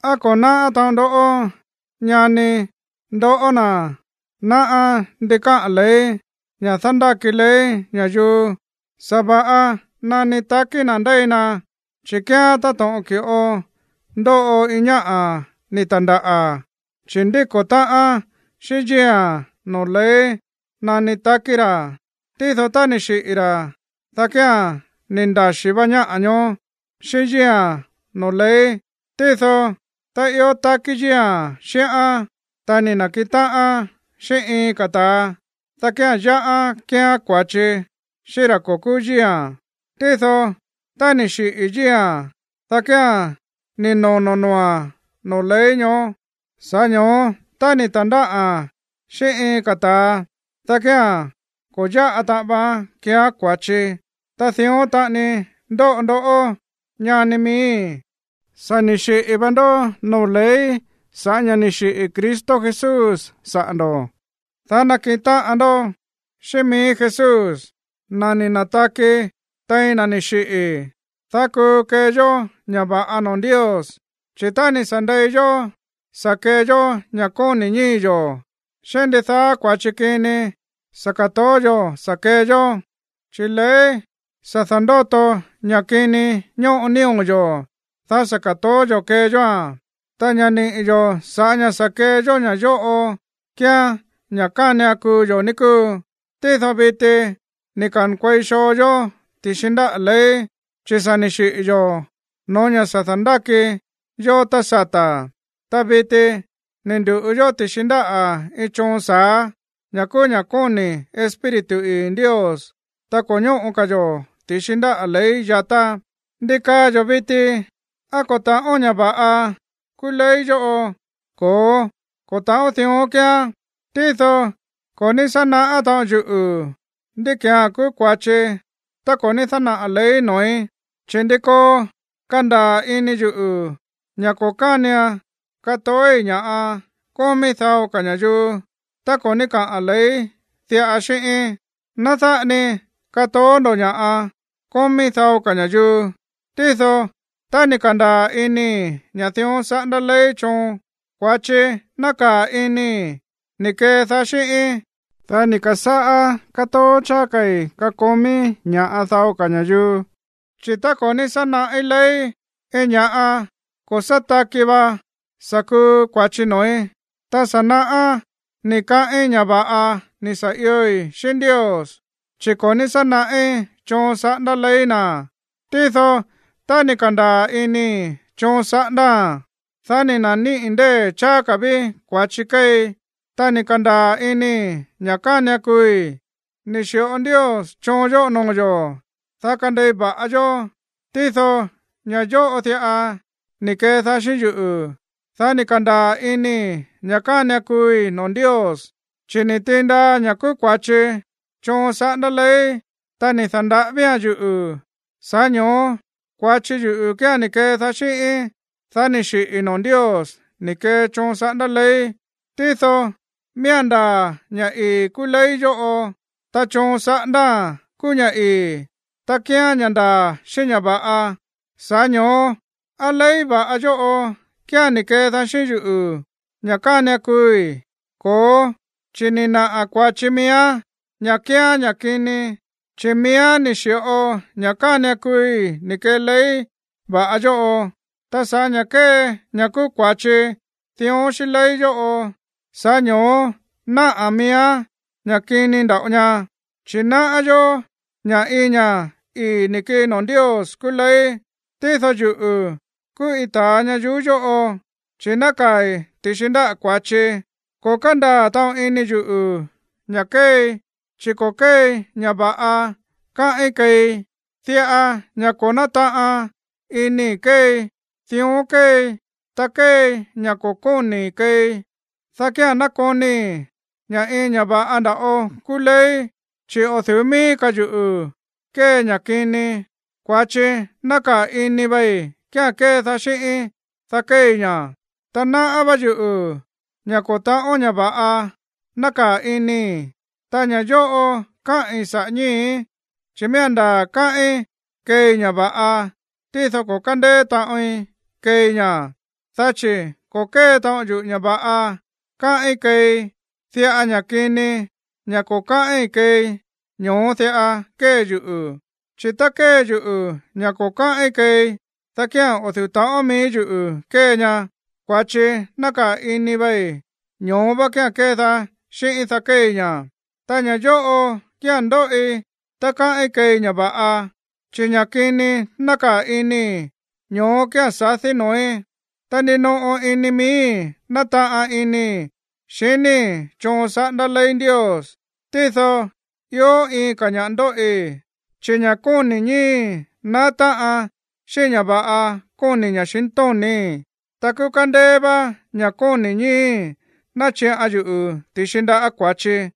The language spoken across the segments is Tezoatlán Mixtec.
¿Á ko̱ náꞌá taꞌon ndó, ñani, ndoꞌó na̱ náꞌá ndi káꞌa̱n ley, ña̱ dándáki ley ña̱yuu sa̱va̱ꞌa nani takí na̱ ndéi na? Chi̱ kíán táto̱ꞌon ki̱ꞌo ndóꞌo iin ñáꞌa̱ ni̱ ta̱ndáꞌa̱, chi̱ ndíko̱ táꞌán xíꞌín yíi̱a̱n noo̱ ley nani takí ra̱. Tído, tá ni̱ xiꞌi̱ ra̱, dá kía̱n ni̱ ndaxí vá ñáꞌa̱ ñoó xíꞌín yíi̱a̱n noo̱ ley. Tído tá ió takí yíi̱a̱n xíꞌán, ta ni̱ na̱kiꞌin táꞌan xíꞌín iin ka̱ ta̱a, dá kía̱n yáꞌán kéeán kua̱chi xíꞌín ra̱ ko̱ kúú yíi̱a̱n. Tído tá ni̱ xiꞌi̱ yíi̱a̱n, dá kía̱n ni̱ nono̱ noo̱a̱n noo̱ ley ñoó. Sa̱ꞌá ño̱ó tá ni̱ ta̱ndáꞌa̱n xíꞌín iin ka̱ ta̱a, dá kía̱n ko̱ yáꞌa taꞌan vaán kéeán kua̱chi. Ta dión taꞌani ndóꞌo ndoꞌó, ñani miíi̱. Sa̱ ni̱ xiꞌi̱ va ndó noo̱ ley sa̱ꞌá ña̱ ni̱ xiꞌi̱ Cristo Jesús saꞌa̱ ndo̱, dá nakiꞌin táꞌan ndó xíꞌín mií Jesús, na̱ ni̱ na̱taki tein na̱ ni̱ xiꞌi̱, dá kuu kee yó ña̱ va̱ꞌa noo̱ Ndios. Chi̱ tá ni̱ sa̱ ndei yó sa̱ kee yó ña̱ kóni̱ ñíi̱ yo̱, xiní ndidaá kua̱chi kini sa̱ ka̱toó yo̱ sa̱ kee yó, chi̱ ley sa̱ da̱ndóto ña̱ kini ñóꞌo nío̱ yo̱, dá sa̱ ka̱toó yo̱ kee yóa̱n, ta ña̱ niꞌi̱ yó sa̱ꞌá ña̱ sa̱ kee yó ña̱ yóꞌo kíán ña̱ kánian kuu yo̱, ní kúu. Tído viti ni̱ ka̱nkuei xoo yó ti̱xi ndáꞌa̱ ley, chi̱ sa̱ ni̱ xiꞌi̱ yo̱ no̱ó ña̱ sa̱ da̱ndáki yó tá sata̱. Ta viti ni̱ ndu̱ꞌu yó ti̱xi ndáꞌa̱ iin choon sa̱á, ña̱ kúú ña̱ kóni̱ Espíritu ii̱ Ndios, ta ko̱ ñóꞌo ka̱ yo̱ ti̱xi ndáꞌa̱ ley yatá. ¿Ndi kaa yo̱ viti? ¿Á ko̱ ta̱ꞌón ña̱ va̱ꞌa kúú ley yóꞌo? Ko̱ó, ko̱ ta̱ꞌón dión kíán. Tído ko̱ ní sá naꞌá taꞌon yuꞌu̱ ndí ki̱án kúú kua̱chi tá ko̱ ní dánaꞌa̱ ley noo̱í. Chi̱ ndi koo kandaa̱ ini yuꞌu̱ ña̱ ko̱ kánian katoói̱ ña̱ꞌa kómí dao ka̱ ña̱yuu tá ko̱ ní kaa ley diꞌa xíꞌíín: “Ná dáꞌa ni katoó ndo̱ ña̱ꞌa kómí dao ka̱ ña̱yuu.” Tído tá ni̱ ka̱ndaa̱ inii̱ ña̱ dión saꞌándá ley choon, kua̱chi nákaa̱ inii̱ ni̱ kedaá xíꞌíín, dá ni̱ ka̱sáꞌá kátoó cháá ka̱i̱ kakomí ña̱ꞌa dao ka̱ ña̱yuu. Chi̱ tá ko̱ ní sá naꞌí ley, iin ña̱ꞌa ko̱ sá taki va sa̱ kuu kua̱chi noo̱í. Tá sa̱ naꞌá ni̱ kaꞌín ña̱ va̱ꞌa ni̱ sa̱ ioi̱ xíꞌín Ndios, chi̱ ko̱ ní sá naꞌí choon saꞌándá ley na̱. Tído tá ni̱ ka̱ndaa̱ inii̱ choon saꞌándáa̱n, dá ni̱ na̱níꞌi̱ ndée̱ cháá ka̱ ví kua̱chi kéei, ta ni̱ ka̱ndaa̱ inii̱ ña̱ kánian kuui̱. Ni̱ xi̱ꞌo Ndios choon yóꞌo noo̱ yo̱, dá kandei va̱ꞌa yó. Tído ña̱ yóꞌo diꞌa ni̱ kedaá xíꞌín yuꞌu̱, dá ni̱ ka̱ndaa̱ inii̱ ña̱ kánian kuui̱ noo̱ Ndios. Chi̱ ni̱ tiin ndaa ña̱ kúú kua̱chi choon saꞌándá ley, ta ni̱ da̱nda̱ꞌávía̱n yuꞌu̱. Sa̱ꞌá ño̱ó kua̱chi yuꞌu̱ kía̱n ni̱ kedaá xíꞌíín, dá ni̱ xiꞌi̱i̱ noo̱ Ndios ni̱ kee choon saꞌándá ley. Tído miía̱n ndaa̱ ña̱ ii̱ kúú ley yóꞌo, ta choon saꞌándáa̱n kúú ña̱ ii̱, ta kíán ña̱ ndaa̱ xíꞌín ña̱ va̱ꞌa. Sa̱ꞌá ño̱ó, ¿á ley va̱ꞌa yóꞌo kía̱n ni̱ kedaá xíꞌín yuꞌu̱ ña̱ kánian kuui̱? Ko̱ó, chi̱ ni̱ naꞌa̱ kua̱chi miíán ña̱ kíán ña̱ kini, chi̱ miíán ni̱ xi̱ꞌo ña̱ kánian kuui̱ ni̱ kee ley va̱ꞌa yóꞌo. Ta sa̱ꞌá ña̱ kée ña̱ kúú kua̱chi dión xíꞌín ley yóꞌo, sa̱ꞌá ño̱ó náꞌa̱n miíán ña̱ kini nda̱ꞌo ña. Chi̱ náꞌá yó ña̱ iin ña̱ ii̱ ni̱ kii noo̱ Ndios kúú ley, tído yuꞌu̱ kúú iin ta̱a ñayuú yóꞌo, chi̱ nákaa̱i̱ ti̱xi ndáꞌa̱ kua̱chi. Ko̱ kándaa̱ taꞌon ini yuꞌu̱ ña̱ kéei. Chi̱ ko̱ kéei ña̱ va̱ꞌa káꞌín keei. Diꞌa ña̱ ko̱ nátaꞌan inii̱ keei, dión kéei. Tá kéei ña̱ ko̱ kóni̱i̱ keei, dá kía̱n nákonii̱ ña̱ iin ña̱ va̱ꞌa nda̱ꞌo kúú ley. Chi̱ o̱ du̱ú mií ka̱ yuꞌu̱ kée ña̱ kini. Kua̱chi nákaa̱ ini vei kía̱n kédaá xíꞌíín, dá kéei ña̱. Ta náꞌá vá yuꞌu̱ ña̱ ko̱ ta̱ꞌón ña̱ va̱ꞌa nákaa̱ inii̱, ta ña̱ yóꞌo káꞌi̱n saꞌa̱ ñíi̱í. Chi̱ miía̱n ndaa̱ káꞌín keei ña̱ va̱ꞌa, tído ko̱ kándeé taꞌoin keei ña̱. Dá chi̱ ko̱ kée taꞌon yuꞌu̱ ña̱ va̱ꞌa káꞌín keei. Diꞌa ña̱ kini, ña̱ ko̱ káꞌín keei, ñoó diꞌa kée yuꞌu̱. Chi̱ tá kée yuꞌu̱ ña̱ ko̱ káꞌín keei, dá kía̱n o̱ du̱ú ta̱ꞌón mií yuꞌu̱ kée ña. Kua̱chi nákaa̱ ini vei, ño̱ó vá kía̱n kédaá xíꞌíín, dá kéei ña̱. Ta ña̱ yóꞌo kía̱n ndóꞌi tá káꞌín keei ña̱ va̱ꞌa, chi̱ ña̱ kini nákaa̱ inii̱, ñoó kía̱n sadí noo̱í. Ta ndinoꞌo ini miíi̱ nátaꞌan inii̱ xiníi̱ choon saꞌándá ley Ndios, tído ió iin ka̱ ña̱ꞌa ndóꞌi, chi̱ ña̱ kóni̱ ñíi̱í naá táꞌan xíꞌín ña̱ va̱ꞌa kóni̱ ña̱xintóni̱í. Ta kúú kándéé vá ña̱ kóni̱ ñíi̱í náchiꞌan yuꞌu̱ ti̱xi ndáꞌa̱ kua̱chi.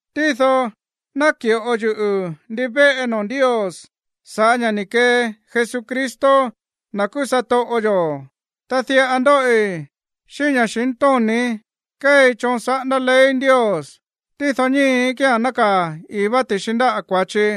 Tído náki̱ꞌo yuꞌu̱ ndivéꞌe noo̱ Ndios sa̱ꞌá ña̱ ni̱ kee Jesucristo, na̱ kúú satoꞌo yo̱. Ta diꞌa ndóꞌi: xíꞌín ña̱xintóni̱í kéei choon saꞌándá ley Ndios, tído ñíi̱í kía̱n nákaa̱ ii̱ vá ti̱xi ndáꞌa̱ kua̱chi.